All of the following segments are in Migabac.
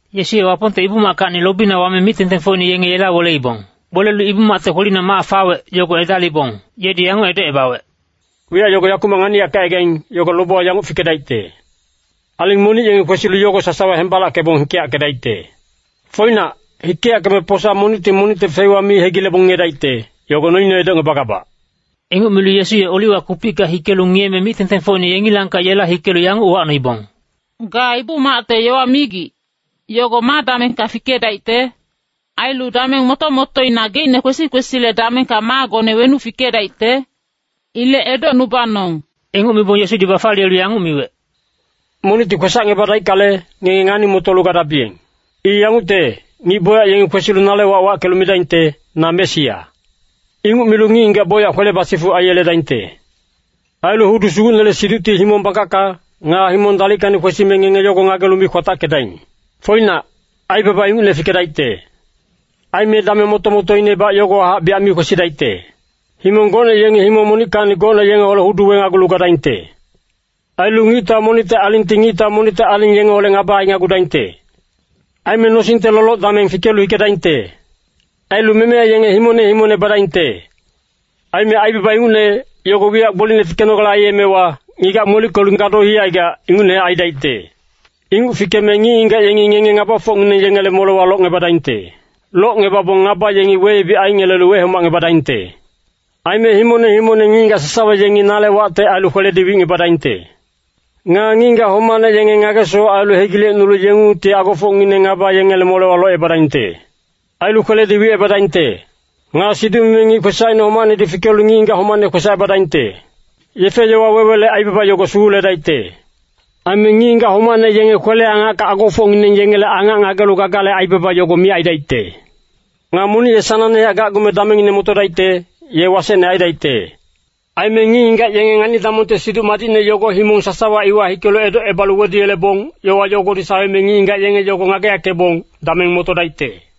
Yesu ye Wapongte Ibu-mackacni lobina wame mic-tengtengfocine yenge yela weleibong. Welelu Ibu-macte kwelina mac fawec, yogo edalibong yedi yanguc edocebawec, “Wiyac yogo yakumac nganiyackegaing, yogo lobewa yanguc fikedaicte. Aling monic yengi kwesilu yogo sasawa hembalackebong hikeyackedaicte. Foinac, hikeyackeme posa monicti monicte feiwa mi hegilebong ngiyedaicte, yogo noine edocngebagabac.” Inguc milu Yesu ye Oliwa kupicka hikelu ngiyeme mic-tengtengfocine yengilangkac yela hikelu yanguc uwacnoibong, “Ga Ibu-macte yowa migic, yogo ma damengka fikedaicte? Ailu dameng moto-motoina geicne kwesi-kwesile damengka maagone wenuc fikedaicte? Ilec edocnubanong.” Inguc mibong Yesudi bafaliyelu yanguc miwec, “Monicti kwesacngebadaickale, ngenge ngani-motolu gadabiyeng. I yangucte, ngic bocyac yengi kwesilu nale wac wackelu midaingte, ‘Na Mesia.’ Inguc milu ngic-ngigac bocyac kwele basifuc aiyeledaingte. Ailu hudu sugucnele siducti himong bangkacka, nga himong dalickacni kwesime ngenge yogo ngagelu mi kwatackedaing. Foinac, aibaba ingucne fikedaicte. Aime dameng moto-motoinebac yogowahac biyac mi kwesidaicte. Himong gocne yengi himong monickacni gocne yengeholec hudu wenagulu gadaingte. Ailu ngictau monicte alingti ngictau monicte aling yengeholec ngaba ainagudaingte. Aime nosingte loloc-dameng fikelu hikedaingte. Ailu memeya yenge himongne himongne badaingte. Aime aibaba ingucne, yogo wiyac gbolicne fikenogale aiyemewa, ngigac molickelu gado hicaigac, ingucnehac aidaicte. “Inguc fikeme ngic-ngigac yengi ngenge ngabafocngineng yengele molewa locngebadaingte. Locngebabong ngaba yengi weyebic aingelelu wehomacngebadaingte. Aime himongne himongne ngic-ngigac sasawa yengi nale wacte ailu kweledi wicngebadaingte. Nga ngic-ngigac homacne yenge ngage-sowac ailu hegilecnulu yengungtihac agofocngineng ngaba yengele molewa locebadaingte. Ailu kweledi wicebadaingte. Nga siduc-mimi ngic kwesacine homacnedi fikelu ngic-ngigac homacne kwesacebadaingte. Yefe-yowa wewele aibaba yogo suguledaicte. Aime ngic-ngigac homacne yenge kwele-angacka agofocngineng yengele angac ngagelu gagale aibaba yogo miyac aidaicte. Nga monic ye sanangnehac gacgume damengine motodaicte, ye wasecne aidaicte. Aime ngic-ngigac yenge ngani-damongte Siduc Madicne yogo himong sasawa iwa hikelu edocebalu weduyelebong, yowa yogodi saweme ngic-ngigac yenge yogo ngageyackebong, dameng motodaicte.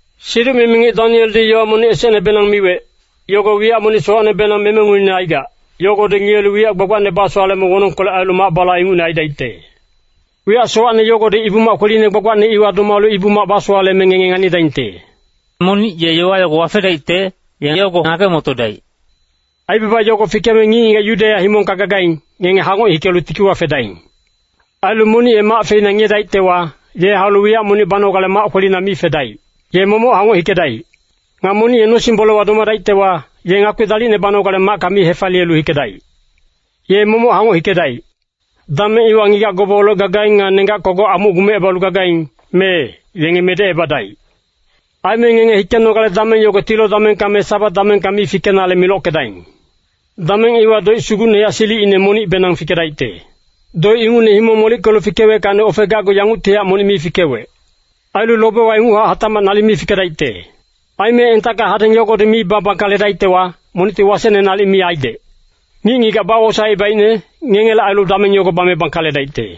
“Siduc-mimi ngic Danieldi yowa monic esecnebenang miwec, yogo wiyac monic sowacnebenang memenguine aigac, yogodi ngiyelu wiyac gbagbacne basowaleme wonongkolec ailu mac-bala ingucne aidaicte. Wiyac sowacne yogodi Ibu-mac kweline gbagbacne iwa domalu Ibu-mac basowaleme ngenge nganidaingte.” Monic ye yowa yago wafedaicte, ye yogo ngage-motodaic. “Aibaba yogo fikeme ngic-ngigac Yudeya himongka gagaing, ngenge hangoc hikelu tikiwa fedaing. Ailu monic ye mac feina ngiyedaictewa, ye haulu wiyac monic banogale mac kwelina mi fedaic. Ye momoc hangoc hikedaic. Nga monic ye nosing-bolewa domadaictewa, ye ngakpi dalicne banogale macka mi hefaliyelu hikedaic. Ye momoc hangoc hikedaic. Dameng iwa ngigac gobeholec gagaing nga nenggac kogoc amuc gumecebalu gagaing, mee, yenge medecebadaic. Aime ngenge hikenogale dameng yogo tilo damengka me Sabat damengka mi fikenale milockedaing. Dameng iwa doic sugucnehac silicine monicbenang fikedaicte. Doic ingucne himong molickelu fikeweckacni ofegacgu yanguctihac monic mi fikewec. Ailu lobewa inguchac hatacmac nalic mi fikedaicte. Aime entacka hadeng yogodi mi babangkaledaictewa, monicti wasecne nalic mi aidec. Ngic-ngigac bawosaecebaicne, ngengele ailu dameng yogo bame bangkaledaicte.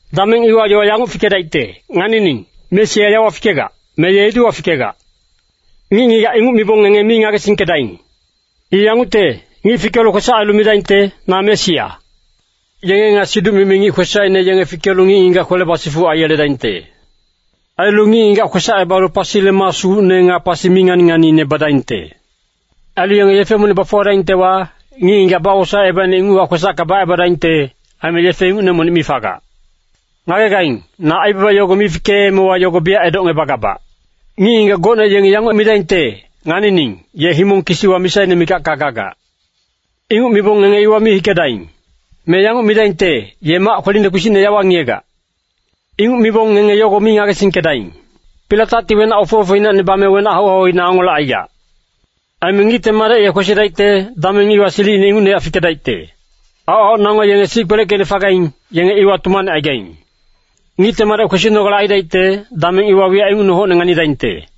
“Dameng iwa yowa yanguc fikedaicte, ‘Nganining, Mesia yawa fikegac,’ me ‘Ye ediwa fikegac.’ Ngic-ngigac inguc mibong ngenge mi ngagesingkedaing. I yangucte, ngic fikelu kwesac ailu midaingte, ‘Na Mesia.’ Yenge nga siduc-mimi ngic kwesacine yenge fikelu ngic-ngigac kwele basifuc aiyeledaingte. Ailu ngic-ngigac kwesacebalu pasile maa sugucne nga pasi mi ngani-nganiine badaingte. Ailu yenge yefe monic bafuwadaingtewa, ngic-ngigac bawosaecebaicne inguchac kwesacka bacebadaingte, aime yefe ingucne monic mi fagac. Ngagegaing, na aibaba yogo mi fikeemewa yogo biyac edocngebagabac. “Ngic-ngigac gocne yengi yanguc midaingte, ‘Nganining, ye himong kisiwa misaine mikacka gagac.’ Inguc mibong ngenge iwa mi hikedaing. Me yanguc midaingte, ‘Ye mac kweline kpisicne yawa ngiyegac.’ Inguc mibong ngenge yogo mi ngagesingkedaing. Pilatacti wenac ofe-ofeinacni bame wenac hau-hauina angolecaigac. Aime Ngicte Madec ye kwesidaicte, dameng iwa silicine ingucnehac fikedaicte. Aoc-aoc nango yenge sic kpeleckeicne fagaing, yenge iwa tumanecaigaing. Ngicte Madec kwesinogale aidaicte, dameng iwa wiyac ingucne hocne nganidaingte.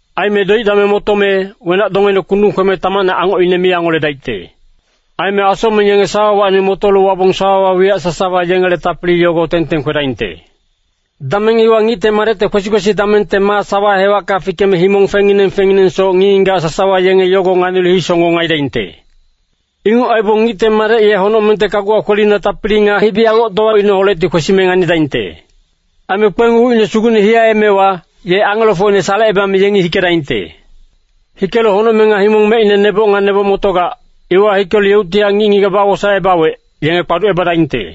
“Aime doic dameng motome, ‘Wenac-dongeine kundung kweme tamacne angocine mi angoledaicte. Aime asocmeng yenge sawawacni motolu wabong sawawa wiyac sasawa yengele tapili yogo teng-teng kwedaingte.’ “Dameng iwa Ngicte Madecte kwesi-kwesi damengte maa sawa hewacka fikeme himong fengnginang fengnginangsoc ngic-ngigac sasawa yenge yogo nganilu hisonggong aidaingte. Inguc aibong Ngicte Madec ye honocmengte kaguwa kwelina tapili nga hibi-angoctowaineholecti kwesime nganidaingte. Aime kpeng ucine sugucne hiyaemewa, ye angelofocine salecebame yengi hikedaingte. Hikelu honocmeng nga himong mecine neboc nga neboc motogac, iwa hikelu yeuctihac ngic-ngigac bawosaecebawec, yenge kpaducebadaingte.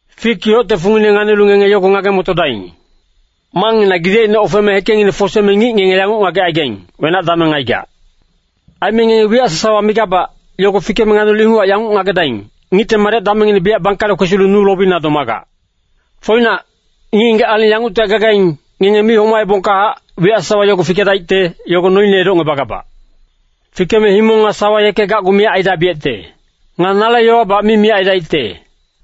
“Fik yocte fungine nganilu ngenge yogo ngage-motodaing. Mangngina gidecine ofeme hekengngine foseme ngic ngenge yanguc ngagecaigaing, wenac dameng aigac. Aime ngenge wiyac sasawa migabac, yogo fikeme nganilu inguchac yanguc ngagedaing, Ngicte Madec damengngine biyac bangkale kwesilu nu lobina domagac. “Foinac, ngic-ngigac aling yanguctihac gagaing, ngenge mi homaebongkahac, wiyac sasawa yogo fikedaicte, yogo noine edocngebagabac. Fikeme himong nga sawa yeke gacgu miyac aidabiyecte. Nga nale yowabac mi miyac aidaicte.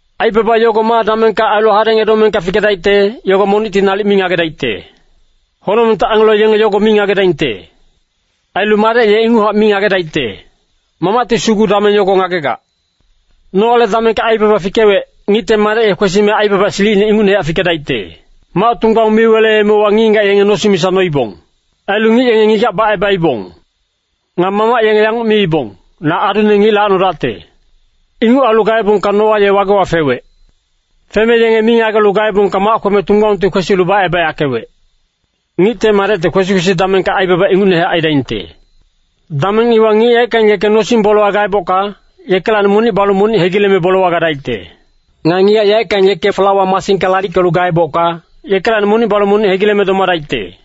“Aibaba yogo ma damengka ailu hadeng edomengka fikedaicte, yogo monicti nalic mi ngagedaicte. Honocmengte angelo yenge yogo mi ngagedaingte. Ailu Madec ye inguchac mi ngagedaicte. Mamacti sugu dameng yogo ngagegac. “Noale damengka aibaba fikewec, Ngicte Madec ye kwesime aibaba silicine ingucnehac fikedaicte. Mac tunggbaung mi weleemewa ngic-ngigac yenge nosing misa noibong. Ailu ngic yenge ngigac bacebaibong. Nga mamac yenge yanguc miibong, ‘Na adune ngic lacnodacte.’ Inguc ailu gaebongka Noa ye wagewa fewec. Feme yenge mi ngagelu gaebongka mac kweme tunggbaungti kwesilu bacebayackewec. Ngicte Madecte kwesi-kwesi damengka aibaba ingucnehac aidaingte. Dameng iwa ngic yaeckang yeke nosing-bolewa gaebocka, yekelacni monic balu monic hegileme bolewa gadaicte. Nga ngigac yaeckang yeke flawa masingka lalickelu gaebocka, yekelacni monic balu monic hegileme domadaicte.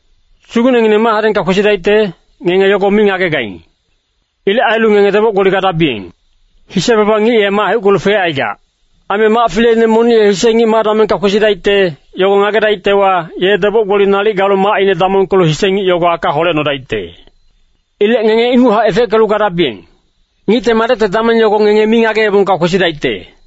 “Sugucnengineng ma hadengka kwesidaicte, ngenge yogo mi ngagegaing. Ilec ailu ngenge deboc-gboli gadabiyeng. Hise-baba ngic ye mac heuckelu fecaigac. Aime mac fileine monic ye hise ngic ma damengka kwesidaicte, yogo ngagedaictewa, ye deboc-gboli nalic galu macine damongkelu hise ngic yogo aka holecnodaicte. Ilec ngenge inguchac efeckelu gadabiyeng. Ngicte Madecte dameng yogo ngenge mi ngageebongka kwesidaicte.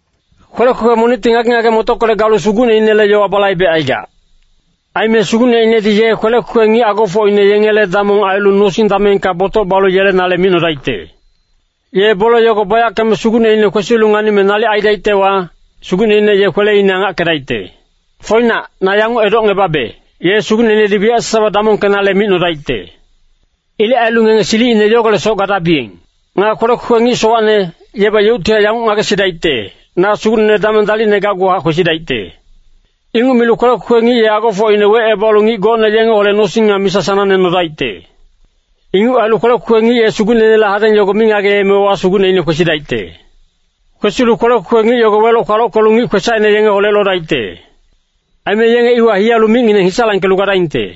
“Kwelec kwekwe monicti ngage-ngage-motockolec galu sugucneinele yowa balaibecaigac. Aime sugucneinedi ye kwelec kwekwe ngic agofocine yengele damong ailu nosing damengka botoc balu yelenale micnodaicte. Ye bole yogo bayackeme sugucneine kwesilu nganime nalic aidaictewa, sugucneine ye kweleine angackedaicte. Foinac, na yanguc edocngebabe, ye sugucneinedi wiyacine sasawa damongkenale micnodaicte. Ilec ailu ngenge silicine yogolecsoc gadabiyeng. “Nga kwelec kwekwe ngic sowacne, yebac yeuctihac yanguc ngagesidaicte, ‘Na sugucnene dameng dalicne gacguhac kwesidaicte.’ Inguc milu kwelec kwekwe ngic ye agofocine wecebalu ngic gocne yengeholec nosing nga misa sanangne nodaicte. Inguc ailu kwelec kwekwe ngic ye sugucneinele hadeng yogo mi ngageemewa sugucneine kwesidaicte. Kwesilu kwelec kwekwe ngic yogo weloc-kwalockelu ngic kwesacine yengeholec lodaicte. Aime yenge iwa hiyalu micngineng hisalangkelu gadaingte.”